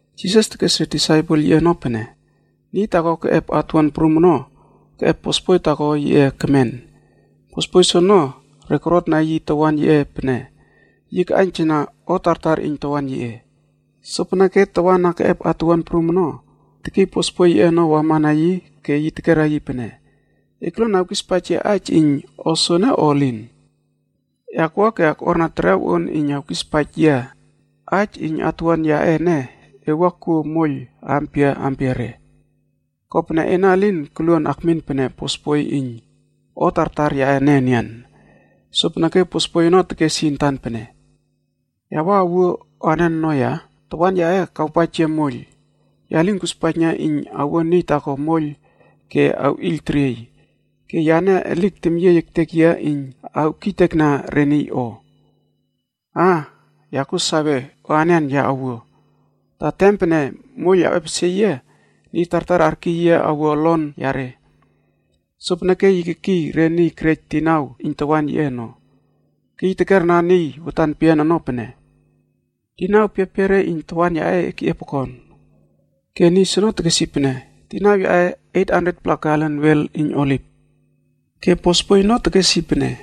Jisas tekes re disaipel yiꞌe ono pene, “Niy taako keꞌep atuwuan prum ono keꞌep bosboi taako yiꞌe kemen. Bosboi soono re korotna yi tawan yiꞌe pene yi kaꞌaiyntana o tartar iyn tawan yiꞌe. Sopeneke tawan na keꞌep atuwuan prum ono kekiy bosboi yiꞌe ono wama na yi ke yi tekera yi pene, ‘E koluon awkispaij yia aij iyn o soene o elin? E akwua ke akꞌuarna terew on iyn awespaij yia aij iyn atuwuan yaꞌe ene e wua kuo moiyl ampia ampiare. Kopene ena elin koluon akmin pene bosboi iyn o tartar yaꞌe ene enian.’ “Sopeneke bosboi ono tekes yi antan pene, ‘Ya wua awuo anen ono ya? Tawan yaꞌe kawpaij yia moiyl. Ya lin kuspaijna iyn awuo niy taako moiyl ke awꞌiyl teriey. Ke yane elik temyiey ektek yia iyn awkiytekna re niy o. Aa! Ya kuo sawe o anen ya awuo, ta tem pene moiyl awꞌepesie yia, niy tartar arkiy yia awua olon yare.’ “Sopeneke yi kekiy re niy kerej dinau iyn tawan yiꞌe ono. Ke yi tekera niy watan peyian ono pene, ‘Dinau piapiare iyn tawan yaꞌe e keꞌiep okon?’ “Ke niy soono tekes yi pene, ‘Dinau yaꞌe 800-pla galen wel iyn oliv.’ Ke bosboi ono tekes yi pene,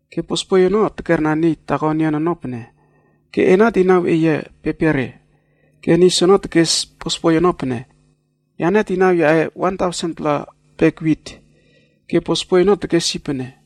“Ke bosboi ono tekera niy taako enian ono pene, ‘Ke ena dinau eye piapiare?’ Ke niy soono tekes bosboi ono pene, ‘Yane dinau yaꞌe 1000-pla bek wit.’ Ke bosboi ono tekes yi pene,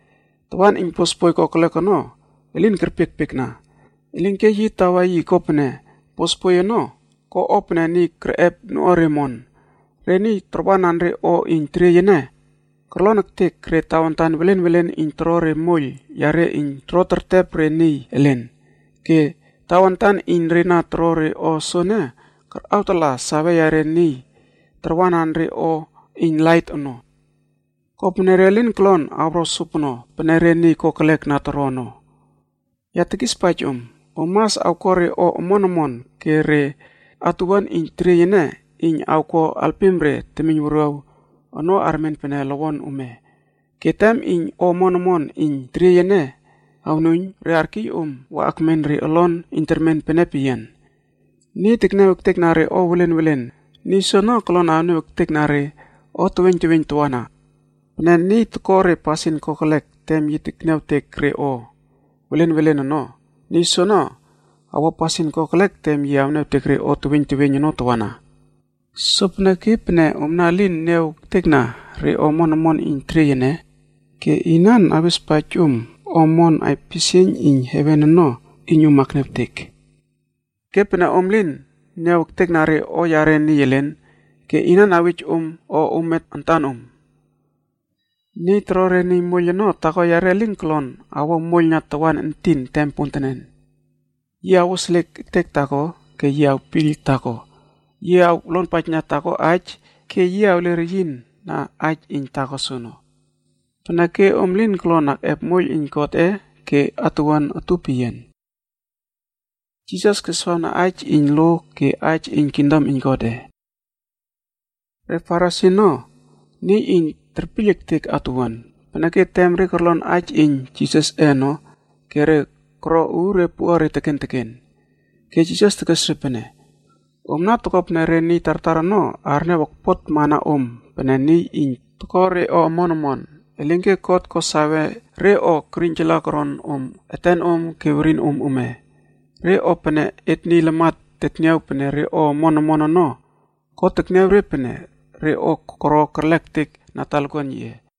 “Tawan iyn bosboi kokelek ono elin kerpiekpiekna, elinke yi tawa yi kopene bosboi ono ko o pene niy kerꞌep noꞌuare omon. Re niy tarwanan re o iyn teriey ene korlon ektek re tawantan welen welen iyn toro re moiyl yare iyn toro tertep re niy elen. Ke tawantan iyn re na toro re o soene karꞌawtala sawe yare niy tarwanan re o iyn lait ono kopene re lin kolon awro sopono pene re niy kokelek na toro ono. Ya tekispaij om, om mas awko re o omon omon ke re atuwuan iyn teriey ene iyn awko alpim re temiyn wuruaw ono armen pene lowon ome. Ke tem iyn o omon omon iyn terieyꞌe ene awnuiyn, re arkiy om wa akmen re olon iyn termen pene peyian. “Niy tekniaw ektekna re o welen welen, niy soono kolon awniaw ektekna re o teweiyn teweiyn tawana. Pene niy toko re pasin kokelek tem yi tekniawtek re o welen welen ono, niy soene awo pasin kokelek tem yi awniawtek re o teweiyn teweiyn ono tawana. Sopeneke pene omna elin niaw ektekna re o omon omon iyn teriey ene, ke inan awespaij om o omon aipisieiyn iyn heven ono iyn om akniawtek? Ke pene om lin niaw ektekna re o yare niy elen, ke inan awej om o ome antanom? “Niy toro re niy moiyl ono, taako yare elin kolon awo moiyl na tawan entin tem pontenen. Yi awoseliek ektek taako, ke yi awpiyl taako. Yi awlonpaijna taako aij ke yi awle reyin na aij iyn taako soono. Peneke om lin kolon akꞌep moiyl iyn Godꞌe ke atuwuanc utup peyian.” Jisas keswawna aij iyn lo ke aij iyn kingdom iyn Godꞌe. Re Farisi ono niy iyn terpiyl ektek atuwuan. Peneke tem re korlon aij iyn Jisasꞌe ono ke re koro uure puꞌare teken teken. Ke Jisas tekes re pene, “Omna toko pene re niy tartar ono arniaw okpotmana om pene niy iyn toko re o omon omon. Elinke God ko sawe re o kerꞌiynjala koron om etenom ke werinom ome. Re o pene et niy lamat tetniaw pene re o omon omon ono, God tekniaw re pene re o koro kerlek ektek na talakuan yiꞌe.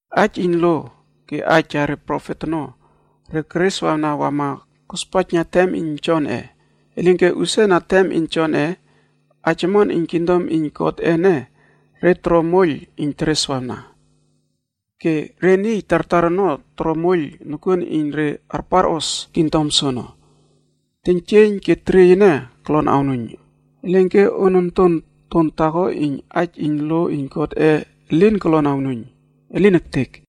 “Aij iyn lo ke aij yare profet ono re kereswawna wama kospaijna tem iyn Jonꞌe. Elinke, usia na tem iyn Jonꞌe,d aij omon Iyn kingdom iyn Godꞌe ene re toro moiyl iyn tereswawna. Ke re niy tartar ono toro moiyl nokuon iyn re arparos kingdom soono. Teiynjieiyn ke teriey ene kolon awnuiyn, elinke on ontonton taako iyn aij iyn lo iyn Godꞌe elin kolon awnuiyn. Elin ektek!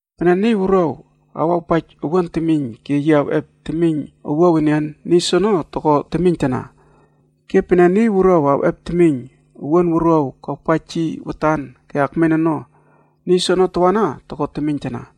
“Pene niy wuruaw awawpaij owuan temiyn ke yi awꞌep temiyn owuaw enian, niy soono toko temiyntana. Ke pene niy wuruaw awꞌep temiyn owuan wuruaw kawpaij yi watan ke akmen ono, niy soono tawana toko temiyntana.”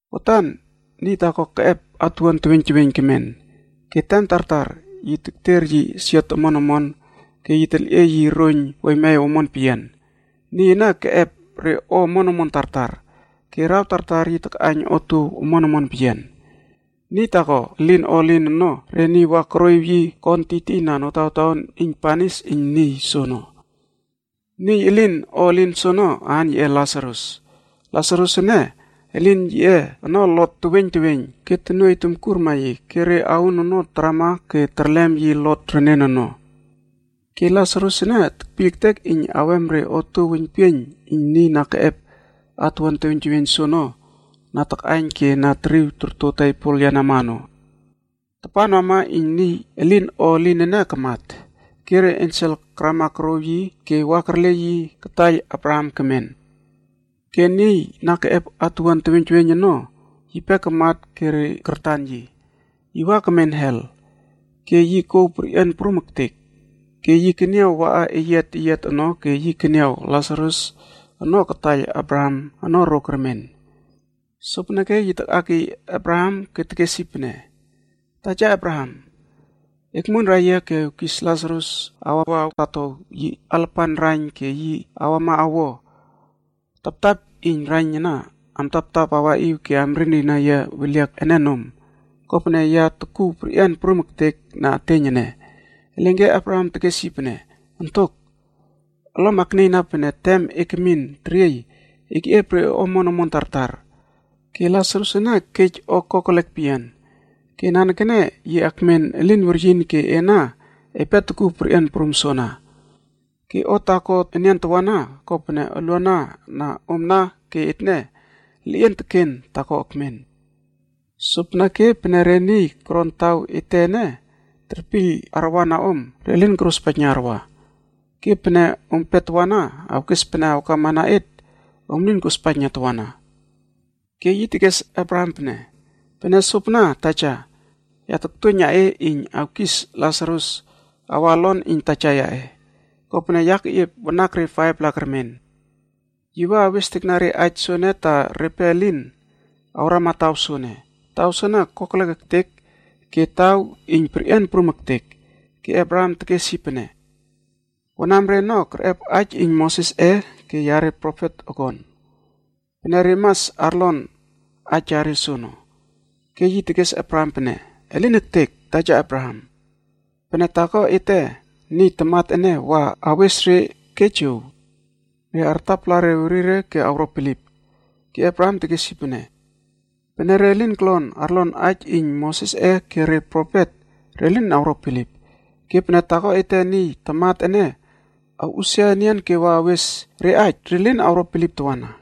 “Watan niy taako keꞌep atuwuan teweiyn teweiyn kemen, ke tem tartar yi tekter yi siot omon omon ke yi telꞌiey yi roiyn weiymew omon peyian. Niy ene keꞌep re o omon omon tartar, ke araw tartar yi takꞌaiyn otuow omon omon peyian. Niy taako elin o elin ono re niy wa koroꞌiw yi kon tiytiyna notawtaon iyn banis iyn niy soono. Niy elin o elin soono, aan yiꞌe Lasarus. Lasarus ene, elin yiꞌe ono lot teweiyn teweiyn ke tonuoiy tomkurma yi, ke re aun ono tarama ke terlem yi lot renen ono. Ke Lasarus ene tekpiyl ektek iyn awem re otuow weiynpieiyn iyn niy na keꞌep atuwuan teweiyn teweiyn soono na takꞌaiyn ke na teriw torto tebol yenama ono. “Tapan wama iyn niy elin o elin ene kamat, ke re ensel karama korouw yi ke wa kerle yi kataiyl Abraham kemen.e Ke niy na keꞌep atuwuan teweiyn teweiyn ono yipe kamat ke re kartan yi. Yi wa kemen helf ke yi kouw perꞌian prum ektek. Ke yi keniaw waꞌa eyiat eyiat ono ke yi keniaw Lasarus ono kataiyl Abraham ono ro kermen. Sopeneke yi takꞌakiy Abraham ke tekes yi pene, ‘Taja Abraham, ekmuonrai yia ke ewkis Lasarus awa awtatow yi alapan raiyn ke yi awama awo taptap iyn raiyn ana amtaptap awraꞌiw ke amrinrina yia weliak ene nom, kopene ya tokuw perꞌian prum ektek na eteiyn ene.’ “Elinke Abraham tekesweyie yi pene, ‘Ontok yaꞌe! Olom aknieyna pene tem e kemin teriey ono, e keꞌiep re o omon omon tartar. Ke Lasarus ene kej o kokelekre ono peyian. Ke nanekene yi akmen elin weryin ke ena epe tokuw perꞌian prum soana. Ke o taako enian tawana, kopene uluana na omna ke etne, leꞌien teken taako ekmen. Sopeneke, pene re niy koron taw ete ene terpiyl arwana om, re lin korospaijna arwa. Ke pene ompe tawana awkes pene awkama na et, om lin kospaijna tawana.’ “Ke yi tekes Abraham pene, ‘Pene sopana, taja, ya taktuoiyna e iyn awkis Lasarus awa olon iyn taja yaꞌe. Kopene ya keꞌiep wanakre 5-pla kermen. Yi wa awestekna re aij soene ta repe elin awrama taw soene. Taw soene kokelek ektek ke taw iyn perꞌian prum ektek.’ “Ke Abraham tekes yi pene, ‘Wanamre ono kerꞌep aij iyn Mosesꞌe ke yare profetg okon. Peneke re mas arlon aij yare soono.’ “Ke yi tekes Abraham pene, ‘Elin ektek! Taja Abraham, pene taako ete niy tamat ene wa awes re ke jow, re artapala re werire ke awro bilip.’ “Ke Abraham tekes yi pene, ‘Pene re lin kolon arlon aij iyn Mosesꞌe ke re profet, re lin awro bilip. Ke pene taako ete niy tamat ene awꞌusia enian ke wa awes re aij, re lin awro bilip tawana.’”